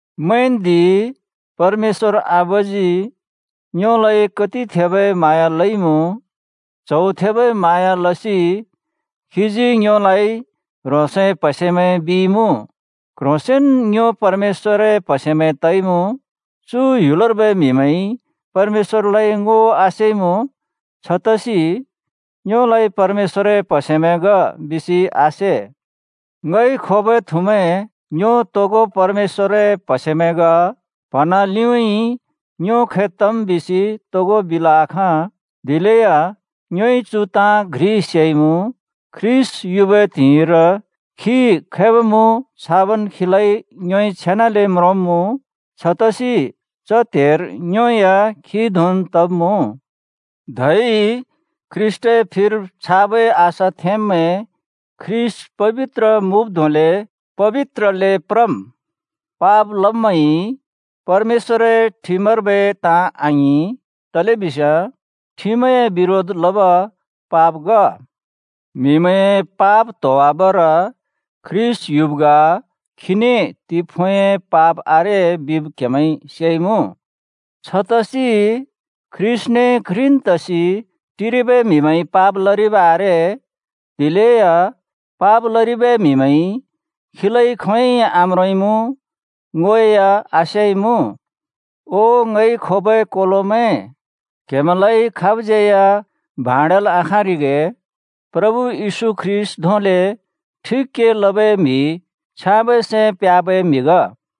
मैंन्दि, परमेश्‍वर आबाजी ङ्योलाइ कति थेबै म्हाँया लइमुँ। च्‍हौ थेबै म्हाँया लसि खीजी ङ्योलाइ “ह्रोंसए प्‍हसेमैं” बिइमुँ। क्ह्रोंसेंन ङ्यो परमेश्‍वरए प्‍हसेमैं तइमुँ। चु ह्‍युलर्बै म्‍हिमैंइ परमेश्‍वरलाइ ङो आसेइमुँ, छतसि ङ्योलाइ “परमेश्‍वरए प्‍हसेमैं ग,” बिसि आसे। ङइ खोबै थुमैं, ङ्यो तोगो परमेश्‍वरए प्‍हसेमैं ग। प्‍हँना लिउँइँ ङ्यो खै तम् बिसि तोगो बिल् आखाँ, दिलेया ङ्योइ चु ताँ घ्रि सेइमुँ: ख्रीष्‍ट युबै त्हिंइर खी खैब मुँ छाबन् खीलाइ ङ्योइ छेनाले म्रोंब्‍मुँ। छतसि च त्हेर ङ्यो या खी धोंन् तब्‍मुँ। धै ख्रीष्‍टए फिर छाबै आशा थेंब्मैं ख्रीष्‍ट पबित्र मुँब् धोंले पबित्रले प्रम्। पाप लब्मैंइ परमेश्‍वरए ठिमर्बै ताँ आङिं, तलेबिस्याँ ठिमए बिरोध लब पाप ग। म्‍हिमैंए पाप त्होवाबर ख्रीष्‍ट युब् ग, खीने तिफुँइ पाप आरे बिब क्‍हेमैंइ सेइमुँ। छतसि ख्रीष्‍टने घ्रिन् तसि टिरिबै म्हिमैंइ पाप लरिब आरे। दिलेया पाप लरिबै म्हिमैंइ खीलाइ खोंयोंइ आम्रोंइमुँ, ङो या आसेइमुँ। ओ ङइ खोबै कोलोमैं, क्‍हेमैंलाइ खाबज्‍यै या भाँड्याल्आखाँरिगे। प्रभु येशू ख्रीष्‍ट धोंले ठिक के लबै म्हि छ्याँबै सैं प्ह्‍याबै म्‍हि ग।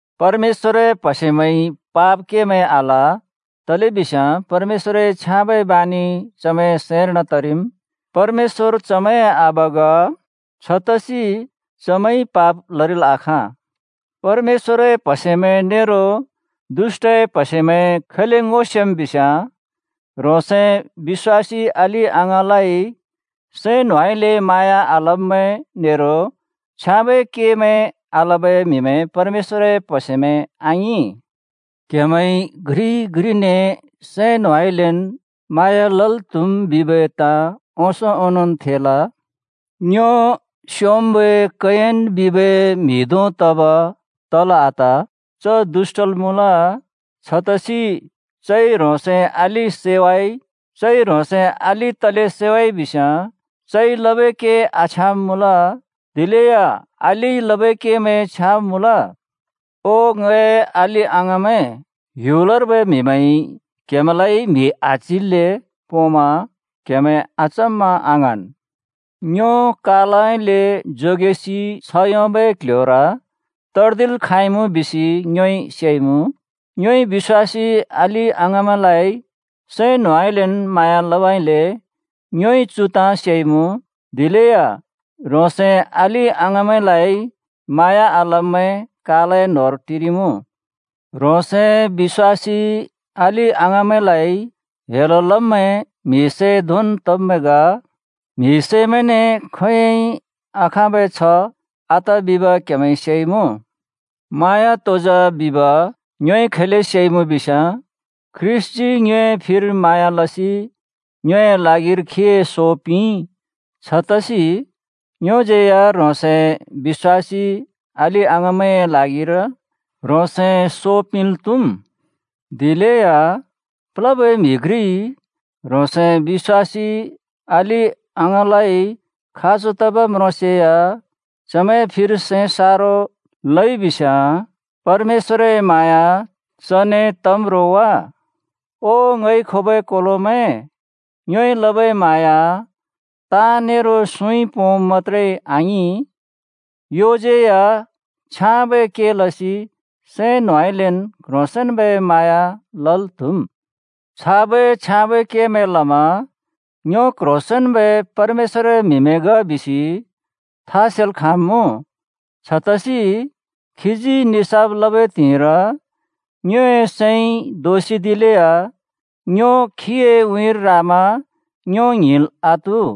परमेश्‍वरए प्‍हसेमैंइ पाप केमैं आल, तलेबिस्याँ परमेश्‍वरए छ्याँबै बानि चमैंए सैंर्न तरिम्। परमेश्‍वर चमैंए आबा ग। छतसि चमैंइ पाप लरिल् आखाँ। परमेश्‍वरए प्‍हसेमैं नेरो दुष्‍टए प्‍हसेमैं खैले ङो सेम् बिस्‍याँ, ह्रोंसए बिश्‍वासी अलि-अङाँलाइ सैं न्होंउँइँलेन् म्हाँया आलब्मैं नेरो छ्याँबै केमैं आलबै म्हिमैं परमेश्‍वरए प्‍हसेमैं आङिं। क्‍हेमैंइ घ्रिइ घ्रिने सैं न्होंउँइँलेन् म्हाँया लल् त्‍हुम् बिबै ताँ ओंसों ओंनोंन् थेल। ङ्यो स्‍योंम्‍बै कयिन बिबै म्‍हि धों तब तल् आत। च दुष्‍टल् मुँल, छतसि चइ ह्रोंसए अलि सैवाइ। चइ ह्रोंसए अलि तले सैवाइ बिस्‍याँ चइ लबै के आछ्याँब मुँल, दिलेया अलिइ लबै केमैं छ्याँब मुँल। ओ ङए अलि-अङाँमैं, ह्‍युलर्बै म्‍हिमैंइ क्‍हेमैंलाइ म्हि आच्हिल्‍ले पोंमा क्हेमैं अचम्मा आङ्हाँन्। ङ्यो कालउँइँले जोगेसि छ्ह योंबै क्‍ल्‍ह्‍योर तर्दिल् खाँइमुँ बिसि ङ्योइ सेइमुँ। ङ्योइ बिश्‍वासी अलि-अङाँमैंलाइ सैं न्होंउँइँलेन् म्हाँयाँ लबइले ङ्योइ चु ताँ सेइमुँ। दिलेया ह्रोंसए अलि-अङाँमैंलाइ म्हाँया आलब्मैं कालए न्होंर टिरिमुँ। ह्रोंसए बिश्‍वासी अलि-अङाँमैंलाइ हेल लब्मैं म्हिसै धोंन् तब्मैं ग। म्हिसैमैंने खोंयोंइ आखाँबै छ्ह आत बिब क्‍हेमैंइ सेइमुँ। म्हाँया तो जा बिब ङ्योइ खैले सेइमुँ बिस्‍याँ ख्रीष्‍टजी ङ्योए फिर म्हाँया लसि ङ्योए ल्हागिर खीए सो पिंइ। छतसि ङ्योज्‍यै या ह्रोंसए बिश्‍वासी अलि-अङाँमैंए ल्हागिर ह्रोंसए सो पिंल् त्हुम्। दिलेया प्लबै म्‍हि घ्रिइ ह्रोंसए बिश्‍वासी अलि-अङाँलाइ खाँचो तब् म्रोंसेया चमैंए फिर सैं सारो लइ बिस्‍याँ, परमेश्‍वरए म्हाँया चने तम्‌ रो वा? ओ ङइ खोबै कोलोमैं, ङ्योइ लबै म्हाँया ताँ नेरो सुँइ पोंब मत्‍त्रे आङिं, योज्यै या छ्याँबै के लसि सैं न्होंउँइँलेन् क्ह्रोंसेंन्‍बै म्हाँया लल् त्‍हुम्। छाबै छ्याँबै केमैं लमा ङ्यो क्ह्रोंसेंन्बै परमेश्‍वरए म्हिमैं ग बिसि था सेल् खाँब्मुँ। छतसि खीजी निसाफ लबै त्हिंइर ङ्योए सैंइ दोसिदिलेया ङ्यो खीए उँइँर रामा ङ्यो ङ्हिंल् आत्हु।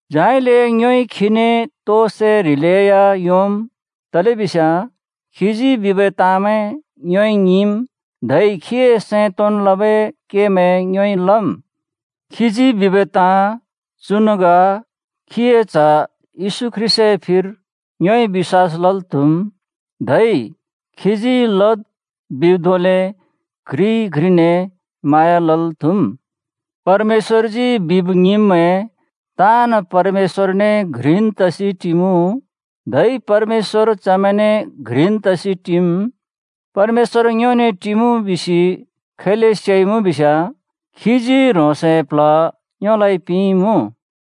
झाइले ङ्योइ खीने तो सै ह्रिलेया योंम्, तलेबिस्याँ खीजी बिबै ताँमैं ङ्योइ ङिंम्, धै खीए सैं तोंन् लबै केमैं ङ्योइ लम्। खीजी बिबै ताँ चुन् ग: खीए च्‍ह येशू ख्रीष्‍टए फिर ङ्योइ बिश्‍वास लल् त्‍हुम्, धै खीजी लद् बिब् धोंले घ्रिइ घ्रिने म्हाँया लल् त्‍हुम्। परमेश्‍वरजी बिब् ङिंब्मैं ताँन् परमेश्‍वरने घ्रिन् तसि टिमुँ, धै परमेश्‍वर चमैंने घ्रिन् तसि टिम्। परमेश्‍वर ङ्योने टिमुँ बिसि खैले सेइमुँ बिस्‍याँ खीजी ह्रोंसए प्ल्ह ङ्योलाइ पिंइमुँ।